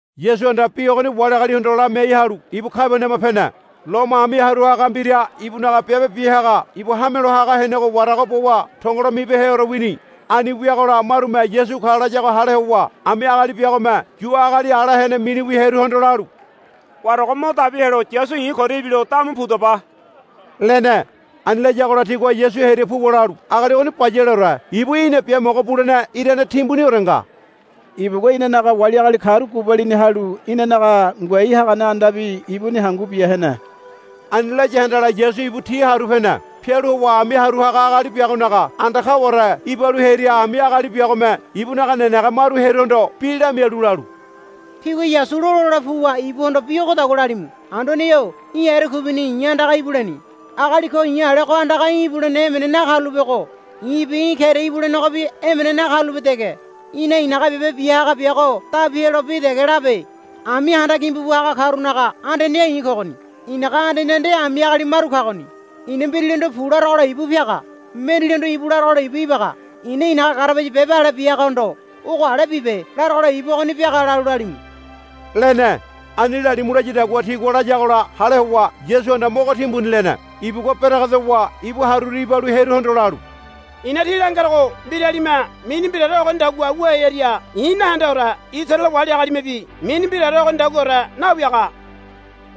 Yasuhanda bi ogoni wali agalihondo lamiai halu ibu Kabaniama pene. Lomo ami haru haga mbira ibunaga biabe bia haga ibu hamelo haga henego warago bowa tongolo mibeheore wini. Ani wiagola marume Yasu ka layago hale howa ami agali biagome Yu agali ala hene miniwi hearuhondo lalu, Warago mo dabi helo Yasu i̱ koria ibilo damu pudaba, lene. Ani layagola tigua Yasu hearia puwa lalu, Agali ogoni bayaleore ibu í̠na biamogo bulene irane timbuniore nga. Ibugua inanaga wali agali karu gubalini halu inanaga ngoai hagane andabi ibuni hangu bia hene. Ani laya handala Yasu ibu ti haru pene. Pialu howa ami haru haga agali biagonaga anda kaware ibalu hearia ami agali biagome ibunaga nenege maru hearuhondo bi lamialu lalu, Tígua Yasu lola hole puwa ibuhondo bi ogodagua lalimu. Anduane-o í̠ erekuibini i̱ andaga ibuleni. Agali ko i̱ alego andaga í̠ ibulene emene nakarulapego i̱bi í̠ keria ibulenegobi emene nakarulape dege. Í̠na i̱naga biabe bia haga biago dabi helo bi dege labe. Ami handa gimbu bu haga karunaga andaneha i̱ kogoni. I̱naga andaneha nde ami agali maru kagoni. I̱na mbiraligohondo, Pu, larogola ibu piaga. Mendalihondo, Íbu, larogola ibu ibaga. I̱na i̱naga garabaya biabe ale bia hagahondo, Ogo ale bibe, larogola ibu ogoni biaga, lalu lalimu, lene. Ani lalimu layadagua tigua layagola hale howa Yasuhanda mogo timbuni lene. Ibugua beregedowa ibu haruru ibalu hearuhondo lalu, I̱na tí langerogo mbiralime mini mbiraore ogonidagua wu hearia i̱ nahendeore Isaraele wali agalimebi mini mbiraore ogonidaguaore nawiaga,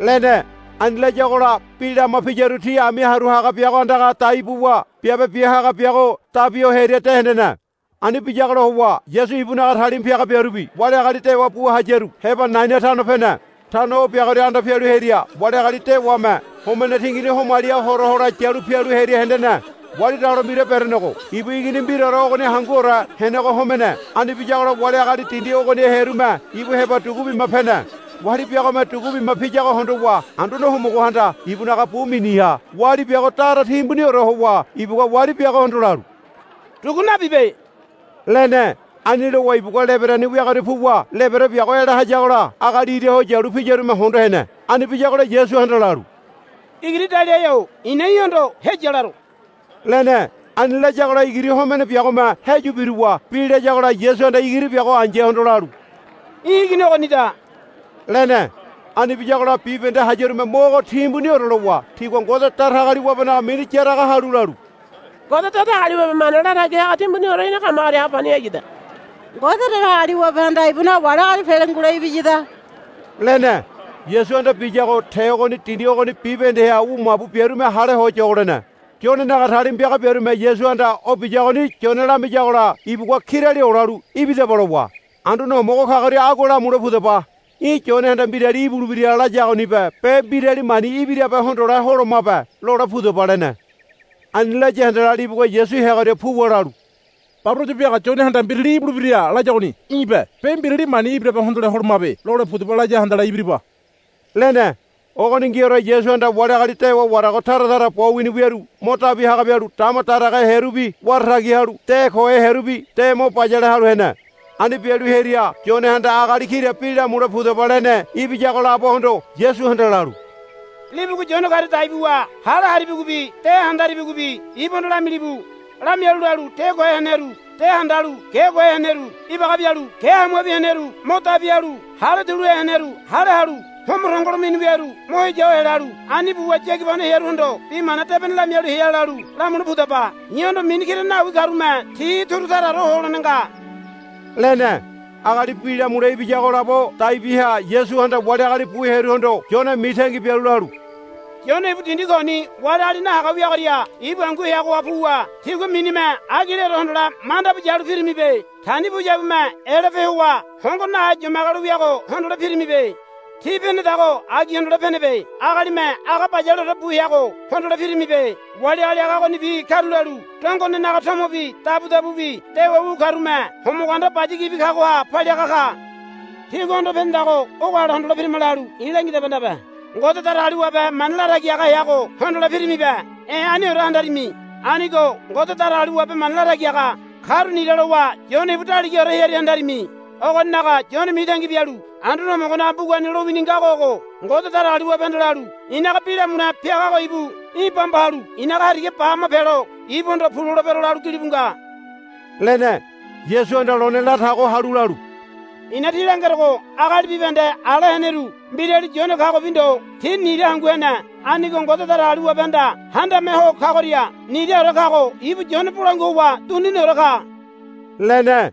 lene. Ani layagola bi lama piyaru ti ami haru haga biago andaga dai buwa biabe bia haga biago dabi ho hearia de hendene. Ani biyagola howa Yasu ibunaga talima piaga biarubi wali agali dewa bu hayaru heba Naina tano pene. Tano o biagoria anda pialu hearia wali agali dewame homene tingini homaliha hora hole yalu pialu hearia hendene. Wali dalo mbira berenego ibu igini mbiraore ogoni hanguore henego homene. Ani biyagola wali agali dindi ogoniha hearume ibu heba dugu bima pene. Wali biagome dugu bima piyago hondowa Anduane Homogohanda ibunaga bu miniha wali biago dara timbuniore howa ibugua wali biagohondo lalu, Dugu nabibe, lene. Ani lowa ibugua lebereni wiagoria puwa lebere biago ela hayagola agali ira ho yalu piyarume hondo hene. Ani biyagola Yasuhanda lalu, Igiri daliahe-o i̱na í̠hondo heya laro, lene. Ani layagola igiri homene biagome heyu biruwa bi layagola Yasuhanda igiri biago ai̱yahondo lalu, Í̠ igini ogonida, lene. Ani biyagola bibahende hayarume mogo timbuniore lowa tigua Ngode Datagaliwabenaga mini yaraga halu lalu, Ngode Datagaliwabe mana latagi haga timbuniore ina kamagoria ha pani hayada. Ngode Datagaliwabehanda ibunaga wali agali pele ngule ibiyada, lene. Yasuhanda biyago te ogoni dindi ogoni bibahendeha wu mabu biarume hale ho yogo lene. Yonenaga talima piaga biarume Yasuhanda o biyagoni Yone lamiyagola ibugua kirali olalu, Ibidaba, lowa, Anduane Homogo kagoria agua lamule pudaba. Í̠ Yonehanda mbirali ibulebira layagonibe be mbirali mani ibirabe hondole holomabe, lole pudaba, lene. Ani laya handala libugua Yasu heagoria puwa lalu, Baboraya biaga Yonehanda mbirali ibulebira layagoni í̠be be mbirali mani ibirabe hondole holomabe, lole pudaba laya handala ibiriba, lene. Ogoningiore Yasuhanda wali agali dewa warago tara tara bo wini wiaru mo dabi haga bialu dama daragahe hearubi wara tagi halu de kohe hearubi de mo bayale halu hene. Ani bialu hearia Yonehanda agali kira bi lamule pudaba lene ibiyago labohondo Yasuhanda lalu, Libugua Yone karia dai buwa hale haribigobi de handaribigobi ibuhondo lamilibu. Lamialu lalu, De kohe heneru de handalu ge kohe heneru ibaga bialu ge hamuabi heneru mo dabi halu hale tuluhe heneru hale halu homo tongolo mini wiaru mo heya ho helalu ani buwa yagibano hearuhondo Bi Mana Debene lamialu hea, lalu lamule pudaba. I̱hondo mini kira nawi karume ti turu taraore ho holene nga, lene. Agali bi lamule ibiyago labo dai biaha Yasuhanda wali agali bu hearuhondo Yone mitangi bialu lalu, Yone ibu dindi koni wali agali nahaga wiagoria ibu hangu heagoha puwa tígua minime agileore hondole manda bu yalu pirimibe. Tani puyabume elape howa hongo nahe yomagelo wiago hondole pirimibe. Tí penedago agi hondole penebe. Agalime aga bayaleore bu heago hondole pirimibe. Wali agali aga ogonibi karulalu dongonenaga tomobi dabudabubi dewa wu karume homogo anda baya gibi kagoha paliaga ka. Tígua hondo penedago ogo ale hondole pirima lalu i̱ langidaba ndabe. Ngode Datagaliwabe mana latagi haga heago hondole pirimibe. E̱ aniore handarimi. Anigo Ngode Datagaliwabe mana latagi haga karu nira lowa Yone ibu daligaore hearia handarimi. Ogoninaga Yone mitangi bialu Anduane Homogonaga mbugani lowini ngago ogo, Ngode Datagaliwabehanda lalu, I̱naga bi lamule piagago ibu í̠ bamba halu í̠naga hariga ba hama pelo ibuhondo, Pu, lolebero, lalu gilibu nga, lene. Yasuhanda lone latago halu lalu, I̱na tí langerogo agali bibahende ala heneru mbirali Yone kagobi ndo ti nira hangu hene. Anigo Ngode Datagaliwabehanda Handame Ho Kagoria niraore kago ibu Yone bolangua howa duniniore ka, lene.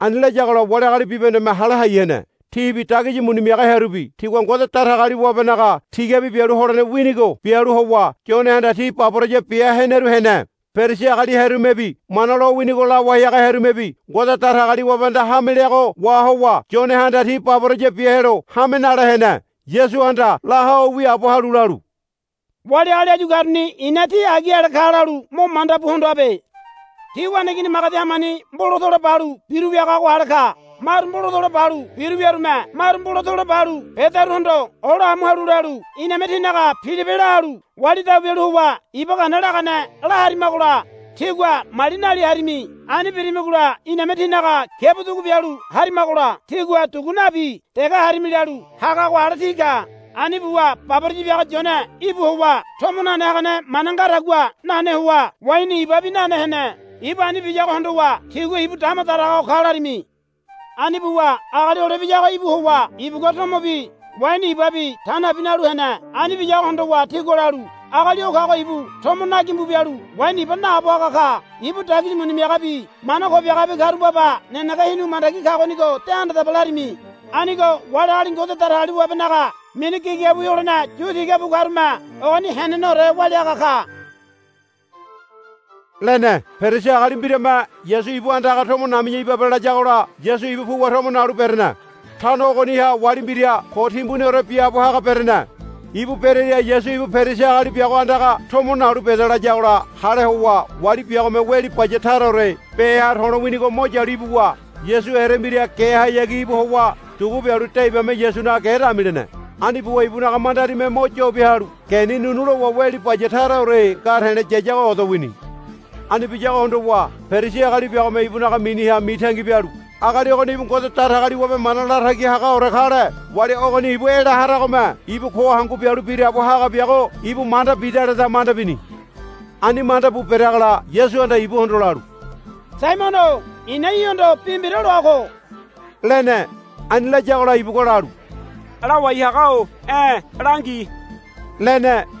Ani layagola wali agali bibahendeme hale hai hene. Tibi dagisi muni miaga hearubi tigua Ngode Datagaliwabenaga tigabi bialu holene winigo bialu howa Yonehanda ti baboraya bia heneru hene. Perisi agali hearumebi Mana lowinigo lawai haga hearumebi Ngode Datagaliwabehanda hame leago wahowa Yonehanda ti baboraya bia helo hame nale hene. Yasuhanda la ho wiaabo halu lalu, Wali agali áyu karuni i̱na ti agi ale ka lalu mo manda bu hondoabe. Ti waneigini magedi hamani mbolatola balu biru wiagago ale ka. Maru mbolatola balu biru wiyarume maru mbolatola balu bedaruhondo ola amu halu lalu, Iname tínaga pilipe la halu wali dabu bialu howa iba gana lagane la harimagola tígua mali nali harimi. Ani birimigola iname tínaga kiabu dugu bialu harimagola tígua dugu nabi dege harimi, lalu hagago ale ti ka. Ani buwa baboraya biaga Yone íbu howa tomo nane hagane mana ngadagua nane howa waini ibabi nane hene. Ibu ani biyago hondowa tígua, Ibu dama daraga ho ka, larimi. Ani buwa Agali Hole Ibiyago íbu howa ibugua tomobi waini ibabi ta nabi nalu hene. Ani biyago hondowa tígua lalu, Agali o kago ibu tomo nagimbu bialu waini iba naabo haga ka. Ibu dagisi muni miagabi mana ko biagabi karu baba nenege hinu mandagi kagonigo de handadaba, larimi. Anigo wali agali Ngode Datagaliwabenaga mini gigabiwi holene yutiga bu karume ogoni heneneore walia haga ka, lene. Perisi agali mbirame Yasu ibu andaga tomo nami̱ya ibabe layagola Yasu ibu puwa tomo nalu berene. Tano ogoniha wali mbira ko timbuniore biaabo haga berene. Ibu berearia Yasu ibu Perisi agali biago andaga tomo nalu beda layagola hale howa wali biagome weli baya taraore beha to̱lo winigo mo yalu ibuwa Yasu erembira gehayagi íbu howa dugu bialu de ibame Yasunaga ge damilene. Ani buwa ibunaga mandarime mo yobiahalu geni nu̱nu̱ lowa weli baya taraore nga te̱le̱ yayago odo wini. Ani biyago hondowa Perisi agali biagome ibuni miniha mitangi bialu, Agali ogoni ibu Ngode Datagaliwabe mana latagi hagaore kale wali ogoni ibu ela haragome ibu ko hangu bialu biraabo haga biago ibu manda bidaleda, manda bini. Ani manda bu bereagola Yasuhanda ibuhondo lalu, Saimono-o i̱na í̠hondo bi mbira loa ko, lene. Ani layagola ibugua lalu, Lawai haga-o e̱ langi, lene.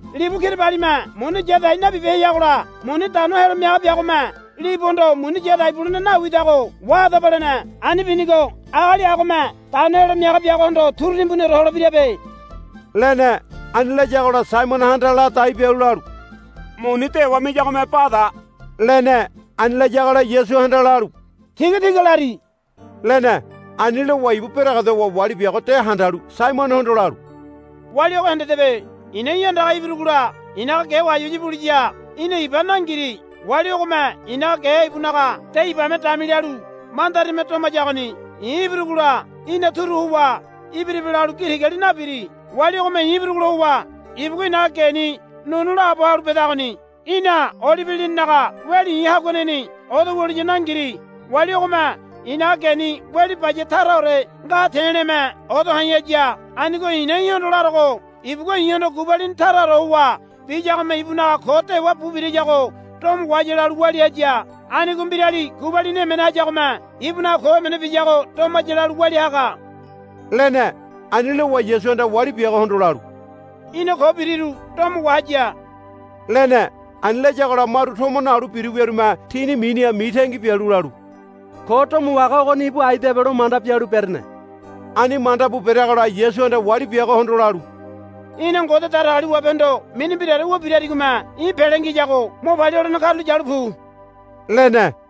Libu kirabalime muni yadai nabibeheyagola muni dano helo miaga biagome libuhondo, Muni yadai bulene nawidago wahadaba, lene. Ani binigo agali agome dano helo miaga biagohondo turu timbuniore holebirabe, lene. Ani layagola Saimonohanda ladai bialu lalu, Muni dewa miyagome bada, lene. Ani layagola Yasuhanda lalu, Tigatiga lari, lene. Ani lowa ibu beregedowa wali biago de handalu Saimonohondo lalu, Wali ogo hendedebe. I̱na í̠ andaga ibirugola i̱naga ge wayawaya buliya í̠na iba nangiri. Wali ogome i̱naga ge ibunaga de ibame damilalu mandarime domayagoni. I̱ ibirugola í̠na turu howa, Ibiribe, lalu gi tigali nabiri. Wali ogome i̱ ibirugola howa ibugua i̱naga geni nu̱nu̱ laabo halu bedagoni. Í̠na olibe lininaga weli i̱ haguaneni odo wuliya nangiri. Wali ogome i̱naga geni weli baya taraore nga te̱le̱me odo ha̱i̱ haya. Anigo i̱na í̠hondo larogo ibugua i̱hondo gubalini taraore howa biyagome ibunaga ko dewa bu birayago domo wahaya lalu walia haya. Anigo mbirali gubalini emene hayagome ibunaga ko emene biyago domaya lalu walia haga, lene. Ani lowa Yasuhanda wali biagohondo lalu, Í̠na ko biriru domo wahaya, lene. Ani layagola maru tomo nalu biru wiarume tini miniha mitangi bialu lalu, Ko domo wahaga ogoni ibu aidabe lomanda bialu berene. Ani mandabu bereagola Yasuhanda wali biagohondo lalu, Í̠na Ngode Datagaliwabehondo mini mbiraore wu birarigome í̠ pele ngiyago mo palia holene karulo yalu pu, lene.